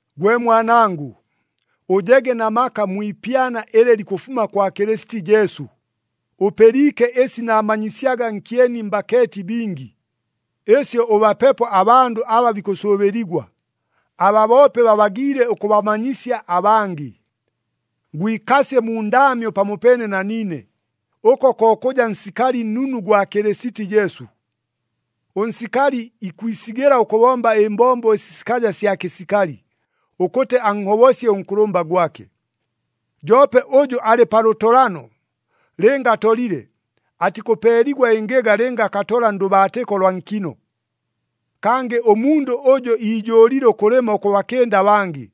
Gwe mwanangʉ, ʉjege na maka mwi ipyana ɨlɨ likʉfuma kwa Kɨlɨsiti Jesu. Ʉpɨliike ɨsi naamanyisyaga nkyeni mbakeeti bingi, ɨsyo ʉbapepo abandʉ aba bikʉsʉʉbɨligwa, aba boope babagiile ʉkʉbamanyisya abangɨ. Gwikasye mu ndaamyo pamopeene na niine, ʉko ko kʉja nsikali nnunu gwa Kɨlɨsiti Jesu. Ʉnsikali ikwisigɨla ʉkʉbomba ɨmbombo ɨsi sikaja sya kɨsikali, ʉkʉtɨ anhobosye ʉnkʉlʉmba gwake. Joope ʉjʉ alɨ pa lʉtolano, lɨnga atolile, atikʉpeeligwa ɨngɨga lɨnga akatola ndʉbaatɨko lwa nkino. Kangɨ ʉmundʉ ʉjʉ iijʉʉlile ʉkʉlɨma ʉkʉbakɨnda abangɨ,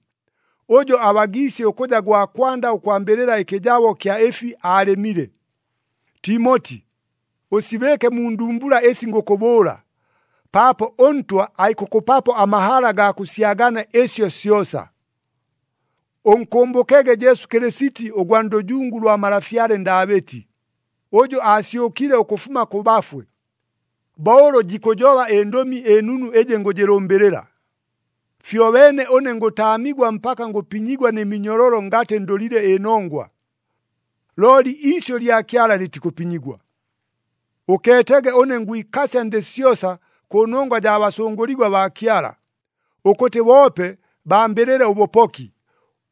ʉjo abagiisye ʉkʉja gwa kwanda ʉkwambɨlɨla ɨkɨjabo kya ɨfi aalɨmile. Timoti, ʉsibɨɨke mu ndumbula ɨsi ngʉkʉbʉʉla, paapo ʉNtwa aikʉkʉpapo amahala gaa kʉsyagania ɨsyo syosa. Ʉnkʉmbʉkege Jesu Kɨlɨsiti ʉgwa ndʉjungu lwa malafyale Ndaabɨti, ʉjʉ aasyʉkile ʉkʉfuma kʉ bafwe, bo ʉlʉ jikʉjoba ɨNdʉmi ɨNunu ɨjɨ ngʉjɨlʉmbɨlɨla. Fyobeene ʉne ngʉtaamigwa mpaka ngʉpinyigwa nɨ minyololo ngatɨ ndʉlile ɨnongwa. Looli iisyʉ lya Kyala lɨtikʉpinyigwa. Ʉkeetege ʉne ngwikasya ndɨ syosa kʉnongwa jaa basʉngʉligwa baa Kyala, ʉkʉtɨ boope bambɨlɨle ʉbʉpoki,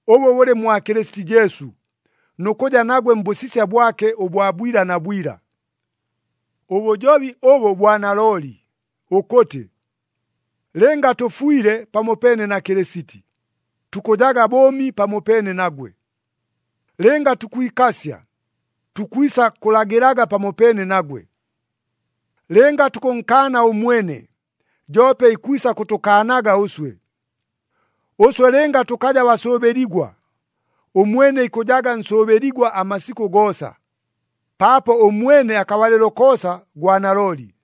ʉbʉ bʉlɨ mwa Kɨlɨsiti Jesu, nʉ kʉja nagwe mbʉsisya bwake ʉbwa bwila na bwila. Ʉbʉjobi ʉbʉ bwa nalooli, ʉkʉtɨ, “Lɨnga tʉfwile pamopeene na Kɨlɨsiti, tukʉjaga bʉʉmi pamopeene nagwe. Lɨnga tukwikasya, tukwisa kʉlagɨlaga pamopeene nagwe. Lɨnga tukʉnkaana ʉmwene, joope ikwisa kʉtʉkaanaga ʉswe. Ʉswe lɨnga tʉkaja basʉʉbɨligwa, ʉmwene ikʉjaga nsʉʉbɨligwa amasikʉ goosa, paapo ʉmwene akabalɨlo koosa gwa nalooli.”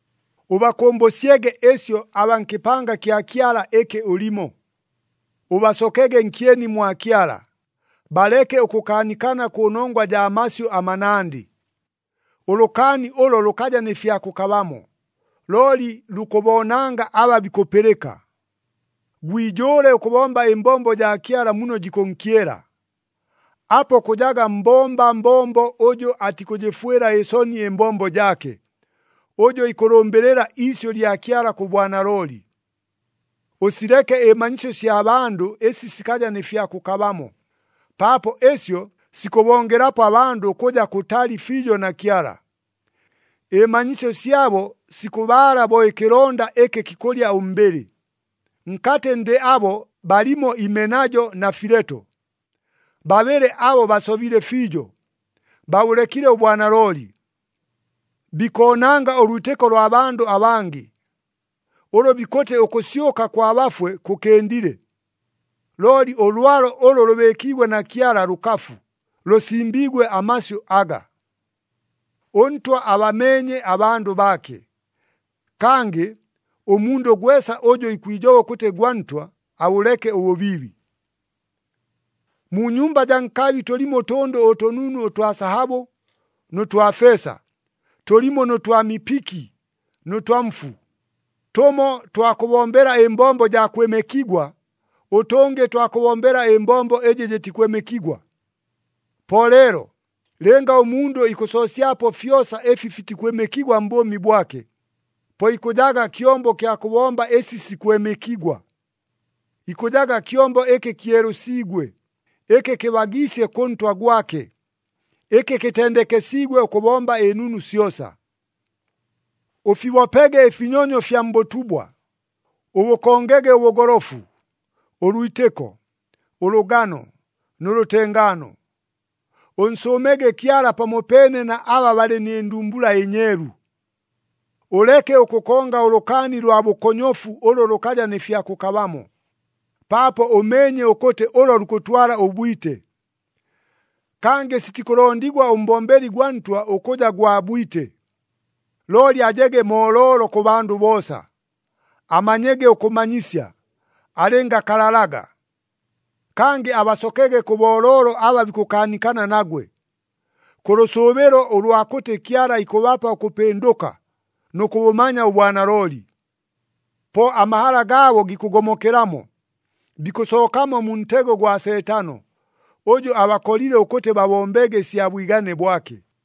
Ʉbakʉmbʉsyege ɨsyo abaa nkɨpanga kya Kyala ɨkɨ ʉlimo. Ʉbasokege nkyeni mwa Kyala, baleke ʉkʉkaanikana kʉnongwa jaa masyʉ amanandɨ. Ʉlʉkaani ʉlo lʉkaja nɨ fya kʉkabamo, looli lukʉboonanga aba bikʉpɨlɨka. Gwijʉʉle ʉkʉbomba ɨmbombo jaa Kyala muno jikʉnkyela. Apo kʉjaga mbomba mbombo ʉjʉ atikʉjɨfwɨla ɨsoni ɨmbombo jaake, ʉjʉ ikʉlʉmbɨlɨla iisyʉ lya Kyala kʉ bwanalooli. Ʉsileke ɨmanyisyo sya bandʉ ɨsi sikaja nɨ fya kʉkabamo, paapo ɨsyo sikʉbongelapo abandʉ ʉkʉja kʉtali fiijo na Kyala. Ɨmanyisyo syabo sikʉbaala bo ɨkɨlonda ɨkɨ kikʉlya ʉmbɨlɨ. Nkatɨ ndɨ abo balimo Imenajo na Fileto. Babɨlɨ abo basobile fiijo, babʉlekile ʉbwanalooli. Bikoonanga ʉlwitɨko lwa bandʉ abangɨ, ʉlʉ bikʉtɨ ʉkʉsyʉka kwa bafwe kʉkɨndile. Looli ʉlwalo ʉlʉ lʉbɨɨkiigwe na Kyala lʉkafu, lʉsimbiigwe amasyʉ aga, “ɄNtwa abameenye abandʉ baake,” kangɨ, “Ʉmundʉ gwesa ʉjʉ ikwijoba ʉkʉtɨ gwa Ntwa, abʉleke ʉbʉbiibi.” Mu nyumba jaa nkabi tʉlimo ʉtʉndʉ ʉtʉnunu ʉtwa sahabʉ nʉ twa feesa, tʉlimo nʉ twa mipiki nʉ twa mfu. Tʉmo twa kʉbombela ɨmbombo jaa kwɨmɨkigwa, ʉtʉngɨ twa kʉbombela ɨmbombo ɨjɨ jɨtikwɨmɨkigwa. Po leelo, lɨnga ʉmundʉ ikʉsoosyapo fyosa ɨfi fitikwɨmɨkigwa mbʉʉmi bwake, po ikʉjaga kyombo kya kʉbomba ɨsi sikwɨmɨkigwa. Ikʉjaga kyombo ɨkɨ kyelʉsiigwe, ɨkɨ kɨbagiisye kʉ Ntwa gwake, ɨkɨ kɨtendekesiigwe ʉkʉbomba ɨnunu syosa. Ʉfibopege ɨfinyonyo fya mbʉtubwa, ʉbʉkongege ʉbʉgolofu, ʉlwitɨko, ʉlʉgano nʉ lʉtengaano. Ʉnsʉʉmege Kyala pamopeene na aba balɨ nɨ ndumbula ɨnyeelu. Ʉleke ʉkʉkonga ʉlʉkaani lwa bʉkonyofu ʉlʉ lʉkaja nɨ fya kʉkabamo, paapo ʉmeenye ʉkʉtɨ ʉlo lukʉtwala ʉbwite. Kangɨ sitikʉlondigwa ʉmbombeli gwa Ntwa ʉkʉja gwa bwite. Looli ajege mooloolo kʉ bandʉ boosa, amanyege ʉkʉmanyisya, alɨngakalalaga. Kangɨ abasokege kʉ booloolo aba bikʉkaanikana nagwe, kʉ lʉsʉʉbɨlo ʉlwa kʉtɨ Kyala ikʉbapa ʉkʉpɨndʉka nʉ kʉbʉmanya ʉbwanalooli. Po amahala gaabo gikʉgomokelamo, bikʉsookamo mu ntego gwa Seetano, ʉjʉ abakolile ʉkʉtɨ babombege ɨsya bwigane bwake.